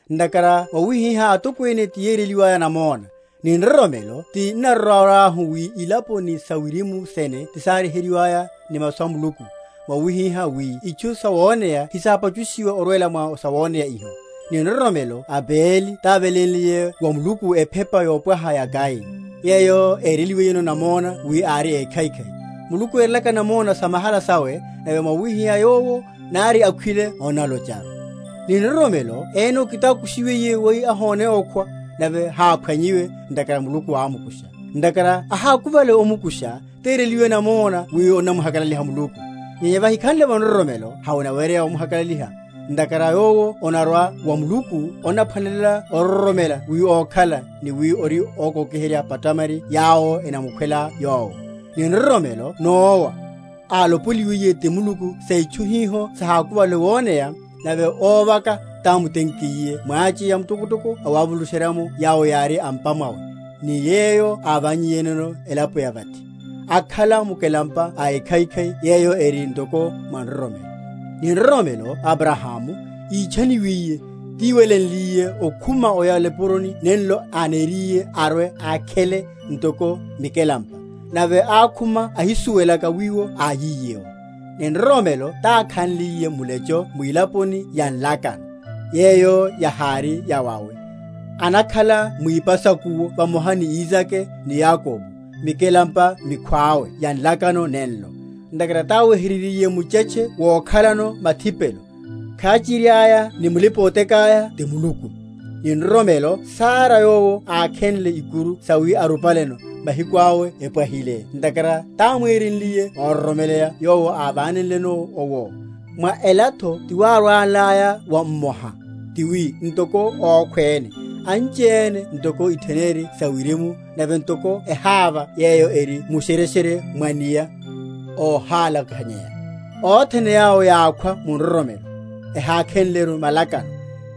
Ntakhara mwawihiha atokwene tiyéreliwaya namona. Ni nroromelo ti n’narórahu wi ilapo ni sa wirimu sene ti sáryeheryiwaya ni masu a Muluku, mwawihihá wi itchu sawoneya hesápachushiwe orwela mwa sawoneya iho. Ni nroromelo Abeli távelénliye wa Muluku ephepa yopwaha ya Kaini, yeyo éreliwiyeno namona wi ári ékhaikhai; Muluku erelaka namona samahala sawe; nave mwawihiha yowo, nari ákhwiliye onnalocharu. Ni nroromelo Enoke tákushiwiye wi ahone okhwa; nave háphwanyiwe, ntakhara Muluku ámukusha: ntakhara ahákuvale omkusha, téreliwiye namona wi onamuhakalaliha Muluku; nyenya vahikhanle’vo nroromelo hevanaweryeya omuhakalaliha; ntakhara yowo onarwa wa Muluku onaphwanelela ororomela wi ókhala, ni wi ori ókókiherya phatamari yawo enamukhwela Yowo. Ni nroromelo Nowa, álopoliwiye ti Muluku sa itchu hiho sahákuvale woneya, nave óvaka, támutenkiye mwacheya mtokotoko awavulusherya’mo yawo yári a’mpa mwawe; ni yeyo ávánnyiyeno elapo ya vathi, akhala mukelampa a ekhaikhai yeyo eri ntoko mwa nroromelo. Ni nroromelo Abrahamu, ítchaniwiye, tíwelenliye okhuma oya o nipuroni nenlo aniriye arwe ákhele ntoko mikelampa; nave ákhuma ahisuwelaka wiwo áyiye’wo. Ni nroromelo tákhanliye mulecho mwilaponi ya nlakano, yeyo yahári yawawe, anakhala mwipa sa’kuwo vamoha ni Isake ni Yakobo, mikelampa mikhwawe ya nlakano nenlo; ntakhara táweheryeryiye muchetche wokhalano mathipelo, khachiri aya ni mulipa‐otekáya ti Muluku. Ni nroromelo Sara yowo ákhenle ikuru sawi arupaleno, mahiku awe epwahile ntakhara támwenriye óroromeleya Yowo ávánenleno owo; mwa elatho tiwárwenlaya wa mmoha, tiwi ntoko ókhwéne, anchiene ntoko itheneri sa wirimu, nave ntoko eháva yeyo eri mu’shereshere mwa’nia, óhálakhanyeya. Othene yawo yákhwa mu nroromelo, ehákhelaru malakano,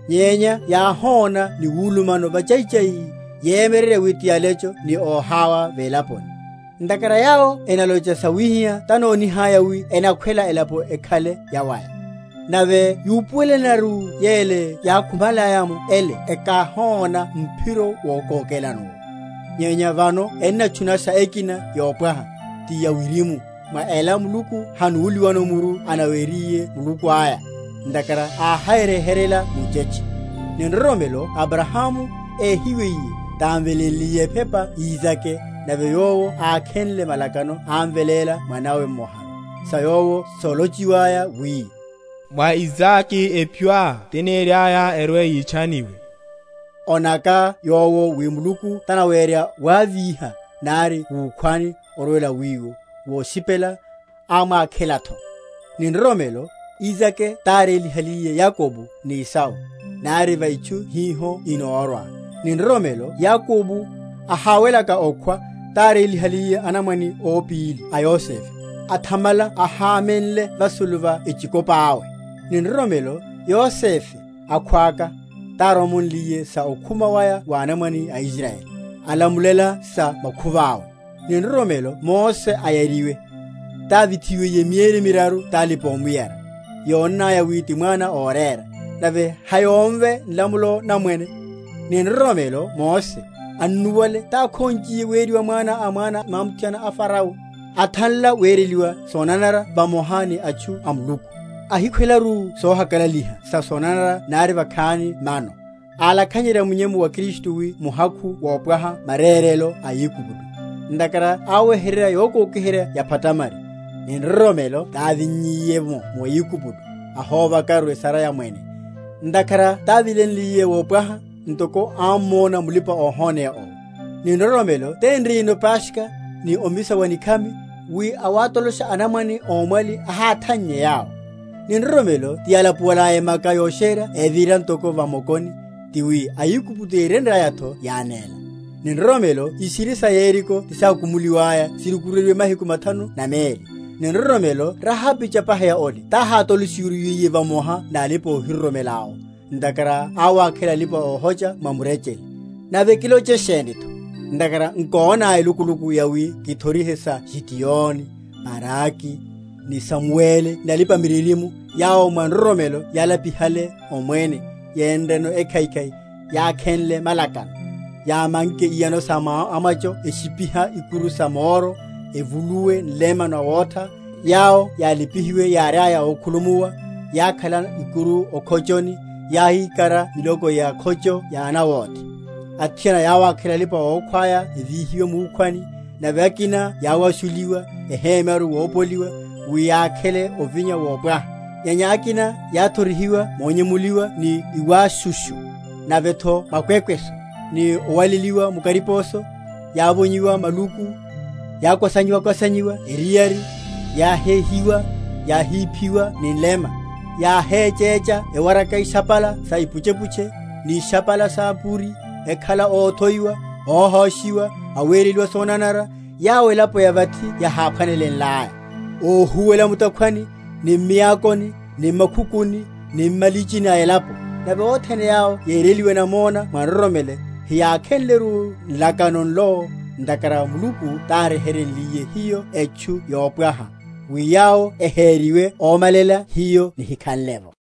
nyenya yáhóna ni wulumano vachaichai, yemyeryerya wi ti alecho ni óhaya velaponi. Ntakhara yawo enalocha sawihiha tanonihaya wi enakhwela elapo ekhale yawaya. Nave yúpuwelenleru yele yákhumalaya’mo ele ekahóna mphiro wokókelano’wo. Nyenya vano enatchunasha ekina yopwaha, ti yawirimu; mwa ela Muluku hanúliwano muru aneriwiye Muluku aya; ntakhara aháryeheryela muchetche. Ni nroromelo Abrahamu, éhiwiye, támvelénliye ephepa Isake, nave yowo ákhenle malakano ámveléla mwanawe mmoharu; sa yowo sálochiwaya, wi, Mwa Isake epyoá tiniriaya erwe‐yitchaniwe: ónaka yowo wi Muluku tanawerya wávíha, nari wukhwani; orwela wiwo, voshipela, ámwákhelatho. Ni nroromelo Isake tárélihaliye Yakobo ni Esau, nari va itchu hiho inórwa. Ni nroromelo Yakobo, ahawelaka okhwa, tárélihaliye anamwane ópíli a Yosefe; athamala ahámenle vasulu va echikopáwe. Ni nroromelo, Yosefe, akhwaka, táromonliye sa okhuma waya wa anamwane a Israyeli; alamulela sa makhuváwe. Ni nroromelo Mose, ayariwe, távithiwiye mieri miraru talipa‐omuyara, yónnaya wi ti mwana órera; nave hayómve nlamulo na mwene. Ni nroromelo Mose, annuwale tákhonchiye weriwa mwanawe a mwana mwamuthiana a Fareo; athanla wereliwa sonanara vamoha ni atchu a Muluku, ahikhwelaru sohakalaliha sa sonanara nari vakhani mano; álakhanyerya munyemu wa Kristu wi muhakhu wopwaha marérelo a Aigupto; ntakhara áweheryerya yokokiherya ya phatamari. Ni nroromelo távinnyiye’mo mu Aigupto, ahóvaru esara ya mwene; ntakhara távilenliye wopwaha, ntoko ámmona mulipa‐ohoneya owo. Ni nroromelo ténriyeno Paskha, ni omisa wa nikhami, wi awátolosha anamwane ómwali ahátannye yawo. Ni nroromelo tiyálapuiyaya Emaka Yosherya evira ntoko va mokoni: tiwi a Aigupto yérenryayatho yánéla. Ni nroromelo ishiri sa Yeriko tisákumuwalaya sirukuryeryiwe mahiku mathanu na meli. Ni nroromelo Rahabi chapaheya ole tahátolo?-?sheryiwiye vamoha nalipa‐ohiroromeláwo, ntakhara áwákhela alipa‐ohocha mwa murechele. Nave kiloche shenitho? ntakhara nkóna elukuluku yawi kithorihe sa Gideoni, Baraki, ni Samueli ni alipa‐miririmo; yawo mwa nroromelo yálapihale omwene, yénreno ekhaikhai, yákhenle malakano, yámanke iyano sa amwacho, eshipiha ikuru sa moro, evuluwe nlema nawetha, yawo yálipihiwe yáriaya ókhulumuwa, yákhala ikuru o’khochoni, yáhíkara miloko ya’khocho ya anawóthe. Athiana yáwákhela alipa‐okhwáya evíhiwe wukhwani; nave akina yáwashuliwa, ehemyaru wopoliwa; wi yákhele ovinya wopwaha; nyenya akina yáthorihiwa monyemuliwa ni iwáshushu, navetho makwekweso, ni owaleliwa mu kariposo; yávonyiwa maluku, yákwasanyiwa eriyari, yáhéhiwa, yáhiphiwa ni nlema, yáhéchécha ewaraka ishapala sa ipuchepuche, ni ishapala sa’puri, ekhala óthoiwa, óhóshiwa, awereliwa sonanara, (yawo elapo ya vathi yaháphwanelelaya): óhuwela mu’takhwani, ni m’miakoni, ni m’makhukuni, ni m’malichini a elapo. Nave othene yawo yéreliwe namona mwa nroromelo, heyákhenleru nlakano nlo, ntakhara Muluku tánryeheryenliye hiyo etchu yopwaha, wi yawo ehériwe ómalela hiyo nihikhanle’vo.